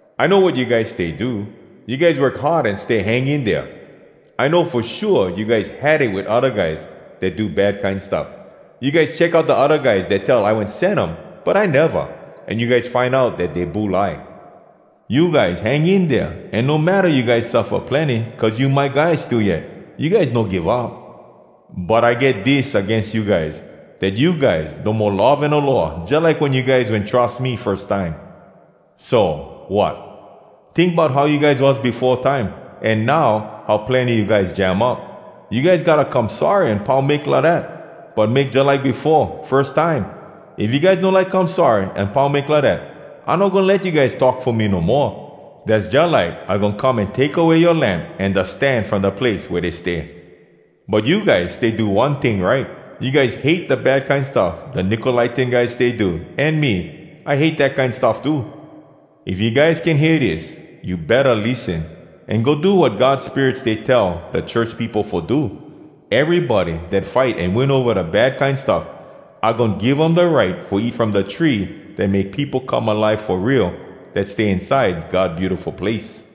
‘I know wat you guys stay do. You guys work hard an stay hang in dea. I know fo shua you guys had it wit odda guys dat do bad kine stuff. You guys check out da odda guys dat tell I wen sen um, but I neva. An you guys find out dat dey bulai. You guys hang in dea, an no matta you guys suffa plenny cuz you my guys, still yet, you guys no give up. But I get dis agains you guys, dat you guys no mo love an aloha jalike wen you guys wen trus me firs time. So, wat? Tink bout how you guys was befo time, an now how plenny you guys jam up. You guys gotta come sorry an pau make lidat, but make jalike befo, firs time. If you guys no like come sorry an pau make lidat, I no goin let you guys talk fo me no moa. Dass jalike I goin come an take away yoa lamp an da stan from da place wea dey stay. But you guys stay do one ting right: You guys hate da bad kine stuff da Nicolaitan guys stay do, an me, I hate dat kine stuff too.’ “If you guys can hear dis, you betta lissen, an go do wat God Spirit stay tell da church peopo fo do!” Erybody dat fight an win ova da bad kine stuff, I goin give um da right fo eat from da tree Dat make peopo come alive fo real, Dat stay inside God Beautiful Place.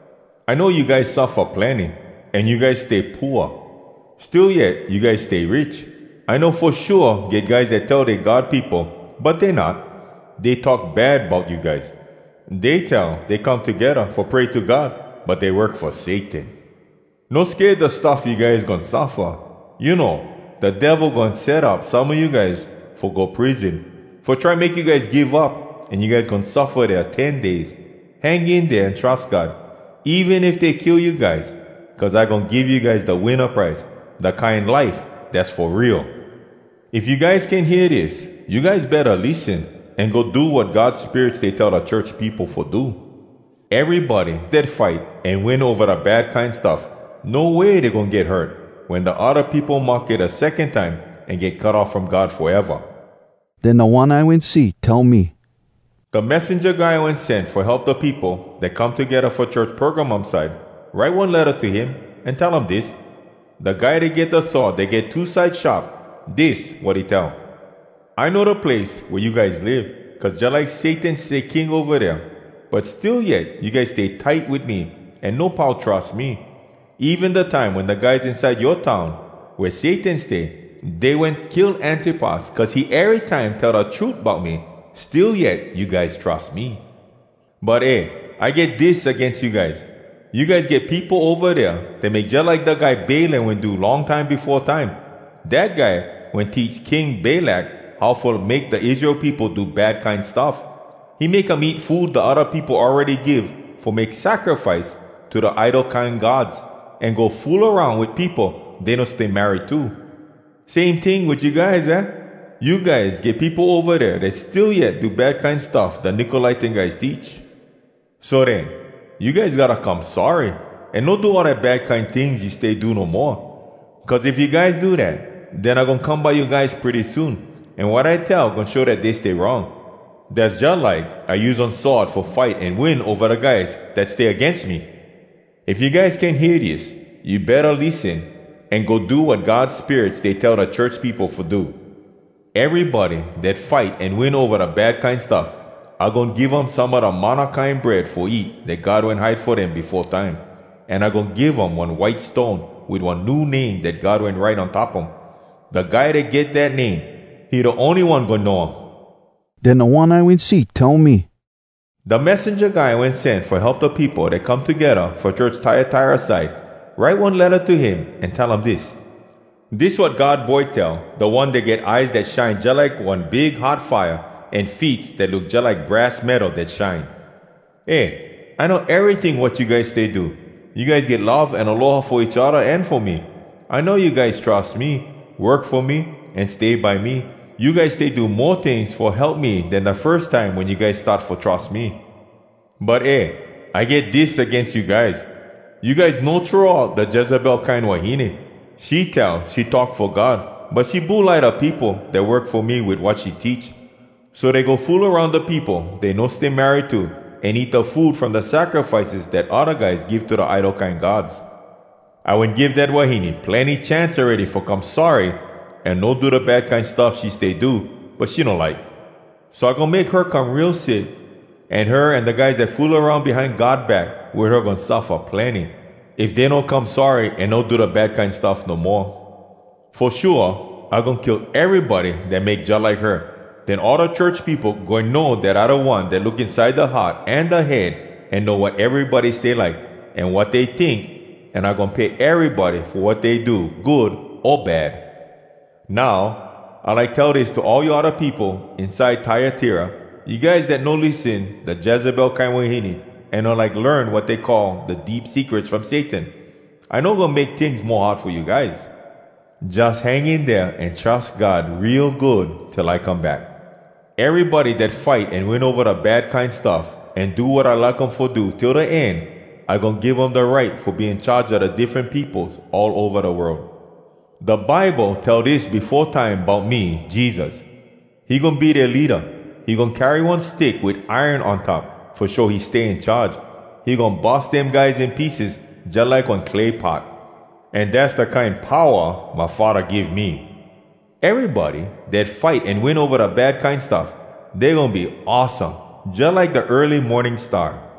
‘I know you guys suffa plenny, an you guys stay pooa. Still yet you guys stay rich! I know fo shua get guys dat tell dey God peopo, but dey not. Dey talk bad bout you guys. Dey tell dey come togedda fo pray to God, but dey work fo Satan. No sked da stuff you guys goin suffa. You know, da Devil goin set up some a you guys fo go prison, fo try make you guys give up, an you guys goin suffa dea ten days. Hang in dea an trus God, even if dey kill you guys. Cuz I goin give you guys da winna prize—da kine life dass fo real!’ “If you guys can hear dis, you guys betta lissen, an go do wat God Spirit stay tell da church peopo fo do!” Erybody dat fight an win ova da bad kine stuff, No way dey goin get hurt Wen da odda peopo mahke da secon time An get cut off from God foeva. Den da One I wen see tell me, “Da messenja guy I wen sen fo help da peopo dat come togedda fo church Pergamum side, write one letta to him, an tell um dis: “Da guy dat get da sword dat get two side sharp—dis wat he tell: ‘I know da place wea you guys live, cuz jalike Satan stay king ova dea. But still yet you guys stay tight wit me, an no pau trus me. Even da time wen da guys inside yoa town, wea Satan stay, dey wen kill Antipas cuz he erytime tell da trut bout me, still yet you guys trus me.’ “‘But eh! I get dis agains you guys: You guys get peopo ova dea dat make jalike da guy Balaam wen do long time befo time. Dat guy wen teach King Balak how fo make da Israel peopo do bad kine stuff. He make um eat food da odda peopo awready give fo make sacrifice to da idol kine gods, an go fool aroun wit peopo dey no stay married to. Same ting wit you guys, aah? You guys get peopo ova dea dat still yet do da bad kine stuff da Nicolaitan guys teach. So den, you guys gotta come sorry, an no do all da bad kine tings you stay do no moa. Cuz if you guys do dat, den I goin come by you guys pretty soon, an wat I tell goin show dat dey stay wrong. Dass jalike I use one sword fo fight an win ova da guys dat stay agains me!’ “If you guys can hear dis, you betta lissen, an go do wat God Spirit stay tell da church peopo fo do!” Erybody dat fight an win ova da bad kine stuff, I goin give um some a da manna kine bread fo eat Dat God wen hide fo dem befo time. An I goin give um one white stone Wit one new name Dat God wen write on top um. Da guy dat get dat name, He da ony one goin know um. Den da One I wen see tell me, “Da messenja guy I wen sen fo help da peopo dat come togedda fo church Tyatira side, write one letta to him, an tell um dis: “Dis wat God Boy tell, da One dat get eyes dat shine jalike one big hot fire, an feets dat look jalike brass metal dat shine: ‘Eh, I know eryting wat you guys stay do. You guys get love an aloha fo each odda an fo me. I know you guys trus me, work fo me, an stay by me. You guys stay do mo tings fo help me den da firs time wen you guys start fo trus me.’ “‘But eh! I get dis agains you guys. You guys no throw out da Jezebel kine wahine. She tell she talk fo God, but she bulai da peopo dat work fo me wit wat she teach. So dey go fool aroun da peopo dey no stay married to, an eat da food from da sacrifices dat odda guys give to da idol kine gods. I wen give dat wahine plenny chance awready fo come sorry an no do da bad kine stuff she stay do, but she no like. So I goin make her come real sick, an her an da guys dat fool aroun behind God back wit her goin suffa plenny, if dey no come sorry an no do bad kine stuff no moa. Fo shua, I goin kill erybody dat make jalike her. Den all da church peopo goin know dat I da One dat look inside da heart an da head an know wat erybody stay like, an wat dey tink, an I goin pay erybody fo wat dey do, good o bad. Now, I like tell dis to all you odda peopo inside Tyatira, you guys dat no lissen da Jezebel kine wahine an no like learn wat dey call “da deep secrets from Satan”: I no goin make tings mo hard fo you guys. Jus hang in dea an trus God real good, till I come back.’” Erybody dat fight an win ova da bad kine stuff, An do wat I like um fo do till da end, I goin give um da right Fo be in charge a da diffren peopos All ova da world. Da Bible tell dis befo time bout me, Jesus: “He goin be dea leada. He goin carry one stick wit iron on top Fo show he stay in charge. He goin bus dem guys in pieces, jalike one clay pot.” An dass da kine powa my Faddah give me. Erybody dat fight an win ova da bad kine stuff, Dey goin be awesome, jalike da early morning star.